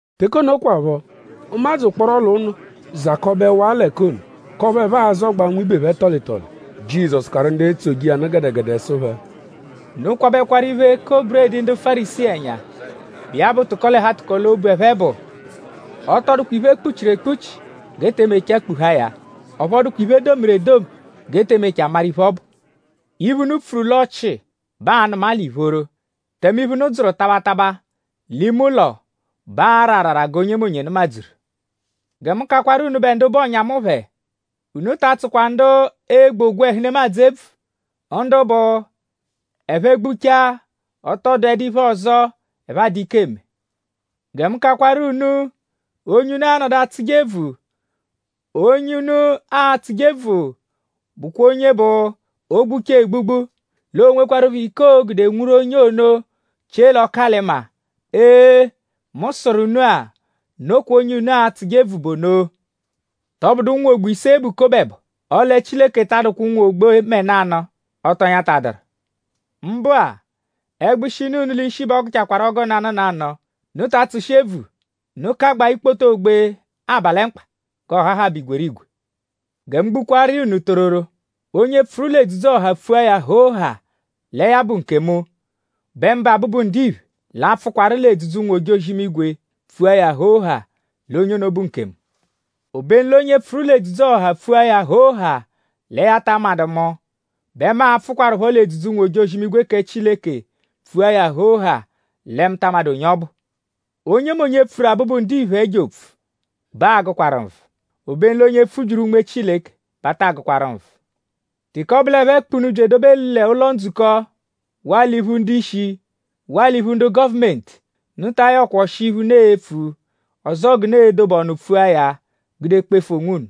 Teke ono kwaphọ; ụmadzu ụkporo l'ụnu zakọbewaa l'ẹka ono; k'ọphu ẹphe azọgbaa nwibe phẹ tọli tọli. Jizọsu karụ ndu etsoje iya nụ gẹdegede sụ phẹ: “Unu kwabẹkwaru iphe-eko-buredi ndu Fárisii ẹnya, bụ iya bụ tụko-l'ẹhu-atụko-l'obu, ẹphe bụ. Ọ tọ dụkwa iphe, e kpuchiru ekpuchi g'e te mechaa kpuhaa ya; ọphu ọ dụkwa iphe, e domiru edomi g'e te mechaa maru iphe, ọ bụ. Iphe, unu pfuru l'ọchii bẹ aa-nụma l'ìphóró; tẹme iphe, unu dzụru taba taba l'ime ụlo bẹ aa-ra arara g'onyemonye nụmadzuru.” “Gẹ mu kakwaru unubẹ ndu bụ ọ̀nyà mu phẹ: Unu ta tsụkwa ndu egbu ogwẹhu nemadzụ ebvu; ndu bụ: ẹphe -gbuchaa; ọ tọ dụedu iphe ọzo, ẹphe adụ ike eme. Gẹ mu kakwaru unu onye unu a-nọdu atsụje ebvu: onye unu a-tsụje ebvu bụkwa onye bụ: o -gbuchaa egbugbu; l'o nwekwarụpho ike, oo-gude nwuru onye ono chie l'ọku-alị-maa. Ee! Mu sụru unu-a; nokwa onye unu a-tsụje ebvu bụ ono. “?Tọbudu ụnwu ogbe ise bụ kobo ẹbo? Ọle Chileke ta adụkwa ụnwu ogbe mẹ nanụ, ọ tọ nyatadụru. Mbụ-a; ẹgbushi, nọ unu l'ishi bẹ ọ gụchaakwaru ọgu nanụ nanụ. Unu ta atsụshi ebvu! Unu kagbaa ikpoto ogbe aba lẹ mkpa; g'ọ hahabẹ igwerigwe.” “Gẹ mu gbukwaaru iya unu tororo; onye pfụru l'edzudzu-ọha pfua ya hoo haa lẹ ya bụ nkemu bẹ mụbe Abụbu-Ndiphe l'a-pfụkwarupho l'edzudzu ụnwu-ojozi-imigwe pfua ya hoo haa l'onye ono bụ nkemu. Obenu l'onye pfụru l'edzudzu-ọha pfua ya hoo haa lẹ ya ta amadụ mu bẹ mu a-pfụkwarupho l'edzudzu ụnwu-ojozi-imigwe kẹ Chileke pfua ya hoo haa lẹ mu ta amadụ onye ọbu. “Onyemonye, pfuru Abụbu-Ndiphe ẹjo opfu bẹ aa-gụkwaru nvụ; obenu l'onye pfubyiru Unme Chileke bẹ a taa gụkwaru nvụ. “Teke ọ bụ l'ẹphe kpụ unu bya edobe l'ụlo-ndzukọ; waa l'iphu ndu-ishi; waa l'iphu ndu gọvumenti; unu ta ayọkwa ọshi iphe, unu e-pfu; ọzoo g'unu e-dobe ọnu pfua ya gude kpefu onwunu.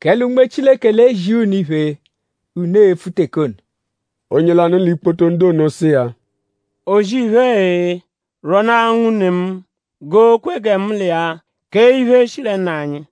Kẹle Unme Chileke l'e-zia unu iphe, unu e-pfu teke ono.” Onye lanụ l'ikpoto ndu ono sụ iya: “O-zì-iphe-e! Rwọnaa nwune mu g'o kwe gẹ mu l'iya kee iphe, shi lẹ nna anyi.”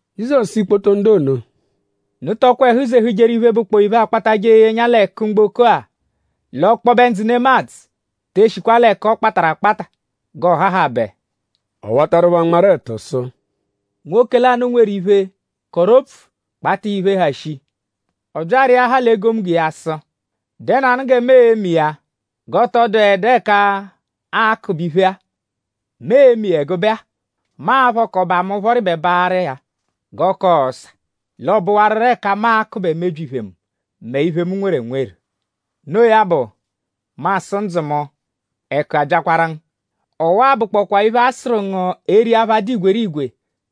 Jizọsu sụ ikpoto ndu ono: “Unu tọkwa ẹhu zehujeru iphe, bụkpoo iphe, akpatajẹ eye ẹnya l'ẹku mgboko-a; l'ọkpobe ndzụ nemadzụ te eshikwa l'ẹku, ọ kpatarụ akpata; g'ọohahabe.” Ọ watarụ phẹ anmarụ ẹtu sụ: “Nwoke lanụ, nweru iphe; kọru opfu; kpata iya iphe, ha shii. Ọ bya arịahaa l'egomunggo sụ: ‘?Dẹnuanu gẹ mu e-me iya g'ọ tọ dụedu ẹka aa-kụbe iphe-a?’ Mu e-me iya ẹgube-a. ‘Mu a-phọka ọba mu phọribebaaru iya g'ọ ka ọsa; l'ọo-bụwaruro ẹka mu a-kụbe mebyi iphe mu; mẹ iphe, mu nweru enweru.’ Noo ya bụ; mu asụ ndzụ mu; ẹku abyakwaru ngu! Ọwa-a bụkpokwaa iphe, a-sụru ngu eri apha, dụ igwerigwe.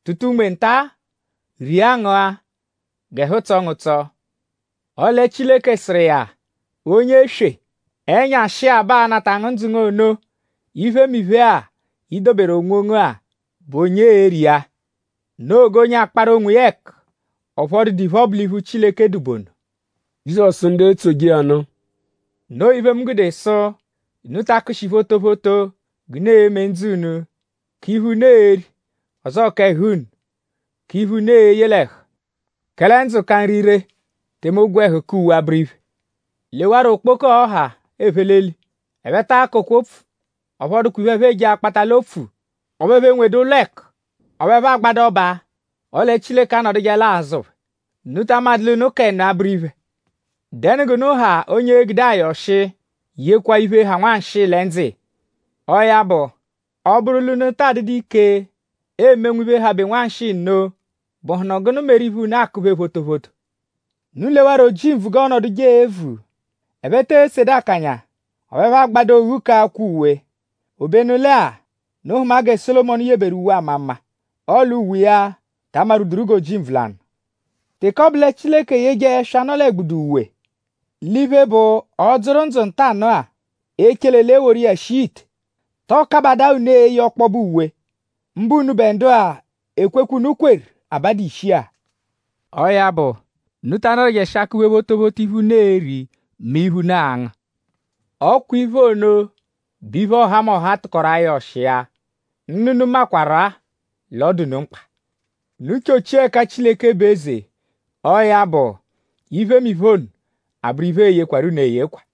Tụta unme nta; ria ngụa g'ẹhu tsọo ngu ụtso!” “Ọle Chileke sụru iya: ‘Onye eswe! Ẹnyashi-a bẹ aa-nata ngu ndzụ ngu ono. Iphemiphe-a, i doberu onwongu-a;?bụ onye e-ri iya?’ “Noo g'onye akparu onwiya ẹku; ọphu ọ dụdu iphe, ọ bụ l'iphu Chileke dụ bụ ono.” Jizọsu sụ ndu etsoje iya nụ: “Noo iphe, mu gude sụ: Unu ta akụshi photophoto g'unu e-me ndzụ unu: k'iphe, unu e-ri; ọzoo k'ẹhu unu: k'iphe, unu e-ye l'ẹhu. Kẹle ndzụ ka nri; tẹme ogwẹhu ka uwe abụru iphe. Lewarọ okpoko-ọ́hà, ephe l'eli! Ẹphe ta akọkwa opfu; ọphu ọ dụkwa iphe, ẹphe eje akpata l'opfu; ọphu ẹphe enwedu ụlo ẹku; ọphu ẹphe agbadu ọba; ọle Chileke anọdujeelaa azụ phẹ.?Unu ta amadụ l'unu ka ẹnu abụru iphe. ?Dẹnu g'unu ha onye e-gude ayọ ọshi; yekwa iphe, ha nwanshịi lẹ ndzụ iya? Ọo ya bụ; ọ -bụru l'unu taa dụdu ike eme nwiphe habe nwanshịi nno;?bụhunu gụnu meru iphe, unu akụ-phe photophoto? Unu lewarọ ojimbvu g'ọonoduje evu. Ẹphe te esedu akanya; ọphu ẹphe agbadu oghu k'akwa uwe. Obenu lẹ-a; unu hụma gẹ Sólomọnu yeberu uwe, ama mma; ọle uwe iya ta amarwuduru g'ojimbvu lanụ. Teke ọ bụ lẹ Chileke eyeje ẹswa, nọ l'ẹgbudu uwe; l'iphe, bụ ọ -dzụru ndzụ ntanụ-a; echele l'e woru iya shia ite;?tọo kabadaa unu eye ọkpobe uwe? mbụ unubẹ ndu-a, ekwekwe, unu kweru abadu ishi-a! Ọo ya bụ; unu ta anọdujeshi akụ-phe photophoto iphe, unu e-ri mẹ iphe, unu a-ngụ. Ọ kwa iphe ono bụ iphe, ọhamoha tụkoru ayọ ọshi iya. Nna unu makwarụ-a l'ọ dụ unu mkpa. Unu chọchia ẹka Chileke bụ eze! Ọo ya bụ; iphemiphe ono abụru iphe, ee-yekwarụ unu eyekwa.”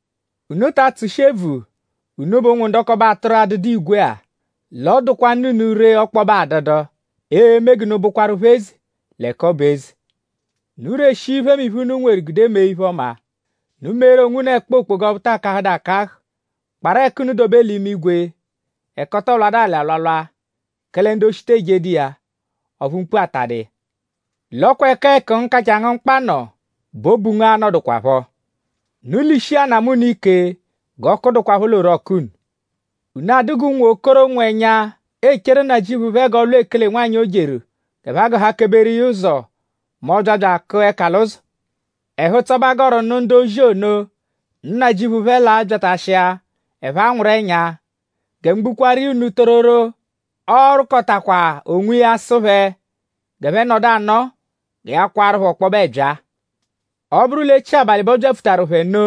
“Unu ta atsụshi ebvu; unubẹ ụnwu ndọkobe atụru, adụdu igwe-a; l'ọ dụkwa Nna unu ree ọkpobe adụdu eme g'unu bụkwarupho eze l'ẹka ọ bụ eze. Unu reshia iphemiphe, unu nweru gude mee iphe-ọma. Unu meeru onwunu ẹkpa okpoga ọphu taa kahụdu akahụ; kparụ ẹku unu dobe l'imigwe; ẹka ọ tọ lwadụ alị alwalwa; kẹle ndu-oshi te ejedu iya; ọphu mkpu atadu iya. L'ọ kwa ẹka ẹku ngu, kachaa ngu mkpa nọ bẹ obu ngu a-nọdukwapho.” “Unu lishia anamụ unu ike; g'ọku dụkwapho l'orọku unu. Unu adụ g'unwokoro, nwụ ẹnya echeru nnajịuphu phẹ g'ọ lwa ekele-nwanyị, o jeru; g'ẹphe a-gụhakeberu iya ụzo mẹ ọ -bya bya akụa ẹka l'ụzo. Ẹhu-ụtso bẹ a gọru nụ ndu-ozi ono, nnajịuphu phẹ l'a-byatashia; ẹphe anwụru ẹnya. Gẹ mu gbukwaaru iya unu tororo; ọo-rụkotakwa onwiya sụ phẹ g'ẹphe nọdu anọo gẹ ya kwaaru phẹ ọkpobe ẹbyaa. Ọ -bụru l'echi abalị bẹ ọ byapfutaru phẹ nno;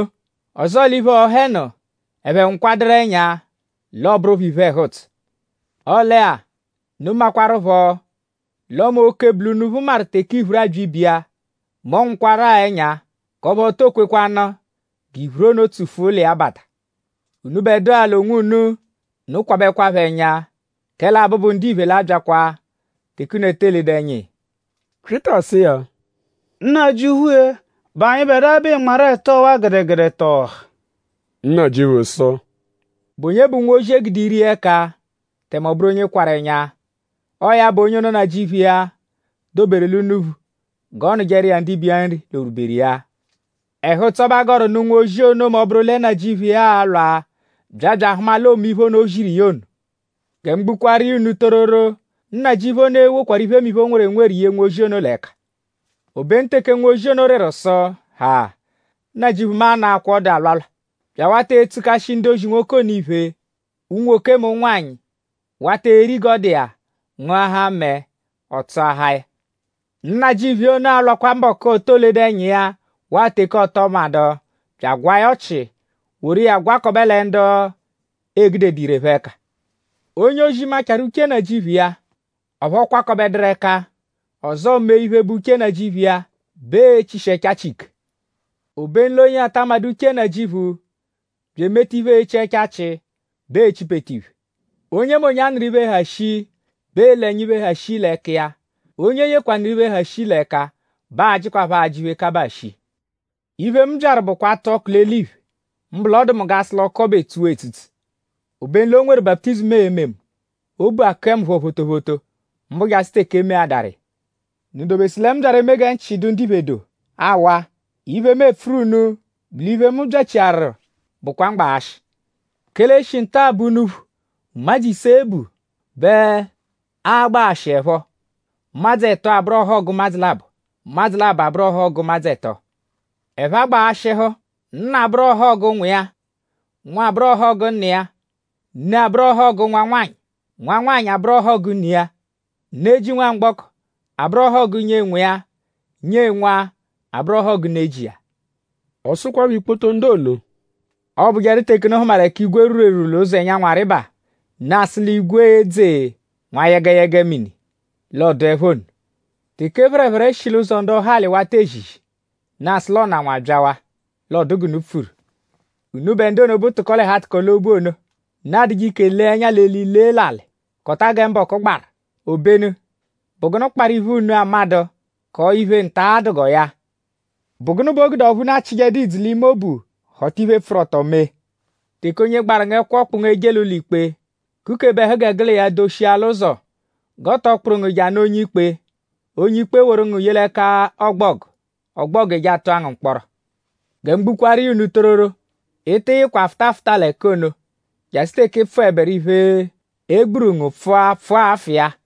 ọzoo l'iphe-ọha ẹnu; ẹphe nwụkwaduru ẹnya; l'ọ bụru phẹ iphe ẹhu-ụtso. Ọle-a; unu makwaruphọ l'ọme oke, bu l'unuphu maru teke iphuru abya ibe iya; mẹ ọ nwụkwaru-a ẹnya; k'ọphu o to kwekwanụ g'iphuru ono tsufua ụlo iya bata. Unubẹdua l'onwunu; unu kwabẹkwapho ẹnya; kẹle Abụbu-Ndiphe l'a-byakwa teke unu te eledu ẹnya iya.” Pyịta sụ iya: “Nnajịuphu-e!?Bụ anyịbedua bẹ ị nmarụ ẹtu ọwa-a gẹdegede tọo ọha?” Nnajịuphu sụ: “?Bụ onye bụ nwozi, e gude ire iya ẹka; tẹme ọ bụru onye kwarụ ẹnya? Ọo ya bụ onye ono, nnajịuphu iya doberu l'unuphu g'ọ nụjeru iya ndibe iya nri l'o rwùbèrù iya. Ẹhu-ụtso bẹ a gọru nụ nwozi ono mẹ ọ -bụru lẹ nnajịuphu iya a-lwa bya bya ahụma l'oome iphe ono, o ziru iya ono. Gẹ mu gbukwaaru iya unu tororo; nnajịuphu ono e-wokwaru iphemiphe, o nweru enweru ye nwozi ono l'ẹka. Obenu teke nwozi ono rịru sụ: ‘Haa! Nnajịuphu mu anọakwaa ọdu alwalwa’; bya awata etsukashi ndu-ozi nwoke ono iphe: unwoke mẹ ụnwanyi; wata eri g'ọ dụ iya; ngụahaa mẹe; ọ tsụahaa ya. Nnajịuphu iya ono a-lwakwa mbọku, o to ledu ẹnya iya waa teke ọ tọ madụ bya agwaa ya ọchi; woru iya gwakọbe lẹ ndu e gudedu ire phẹ ẹka. “Onye-ozi, machaarụ uche nnajịuphu iya; ọphu ọ kwakọbeduru ẹka; ọzoo mee iphe, bụ uche nnajịuphu iya bẹ ee-chishi ẹchachi ike. Obenu l'onye ata amadụ uche nnajịuphu bya emeta iphe echi ẹchachi bẹ ee-chipete iphe. Onyemonye, a nụru iphe, ha shii bẹ ee-le ẹnya iphe, ha shii l'ẹka iya. Onye e yekwanụru iphe, ha shii l'ẹka bẹ aa-jịkwapho ajị iphe, kabaa shii.” “Iphe, mu byaru bụkwa atụ ọku l'eliphe; mbụ l'ọ dụ mu g'a sụ l'ọku ọbu etsuwaa etsutsu! Obenu l'o nweru baputizimu, ee-me mu. Obu akụe mu phọ phoophoophoo; mbụ jasụ teke e meadaru iya. ?Unu dobesụ lẹ mu byaru eme gẹ nchị dụ ndiphe doo? Aawa! Iphe, mu epfuru unu bụ l'iphe, mu byachiaru bụkwa mgbaghashị. Kẹle e -shi nta-a bẹ unuphu, ụmadzu ise bu bẹ a-gbaghashihụepho. Ụmadzu ẹto abụru ọhogu ụmadzu labọ; ụmadzu labọ abụru ọhogu ụmadzu ẹto. Ẹphe a-gbaghashịhu: nna abụru ọhogu nwa iya; nwa abụru ọhogu nna iya. Ne abụru ọhogu nwa-nwanyị; nwa-nwanyị abụru ọhogu ne iya. Ne ji nwamgbọko abụru ọhogu nyee nwa iya; nyee nwa abụru ọhogu ne ji iya.” Ọ sụkwapho ikpoto ndu ono: “Ọobujeru teke unu hụmaru ẹka igwe rwuru erwurwu l'ụzo ẹnyanwu arịba; unu asụ l'igwe e-dze nwa yẹgeyege mini; l'ọoduepho nno. Teke phẹrephere shi l'ụzo ndọhali wata ezizi; unu asụ l'ọnanwu abyawaa; l'ọ dụ g'unu pfuru. Unubẹ ndu ono, bụ tụko-l'ẹhu-atụko-l'obu ono. Unu adụje ike lee ẹnya l'eli lee l'alị; kọta gẹ mbọku gbaru. Obenu?bụ gụnu kparụ iphe, unu amadụ kọo iphe, nta-a dụ g'ọo ya?” “?Bụ gụnu bẹ o gude ọphu unu achịjedu idzu l'ime obu họta iphe, pfụru ọto mee? Teke onye gbaru ngu ẹkwo kpụ ngu eje l'ụlo-ikpe; kukebe ẹhu g'unu l'iya doshia l'ụzo; g'ọ tọ kpụru ngu je anụ onye-ikpe; onye-ikpe e-woru ngu ye l'ẹka ọgbogu; ọgbogu eje atụa ngu mkpọro. Gẹ mu gbukwaaru iya unu tororo; ị tị yịkwa fụta afụta l'ẹka ono jasụ teke ị pfụeberu iphe, e gburu ngu pfụa pfụa afụ iya.”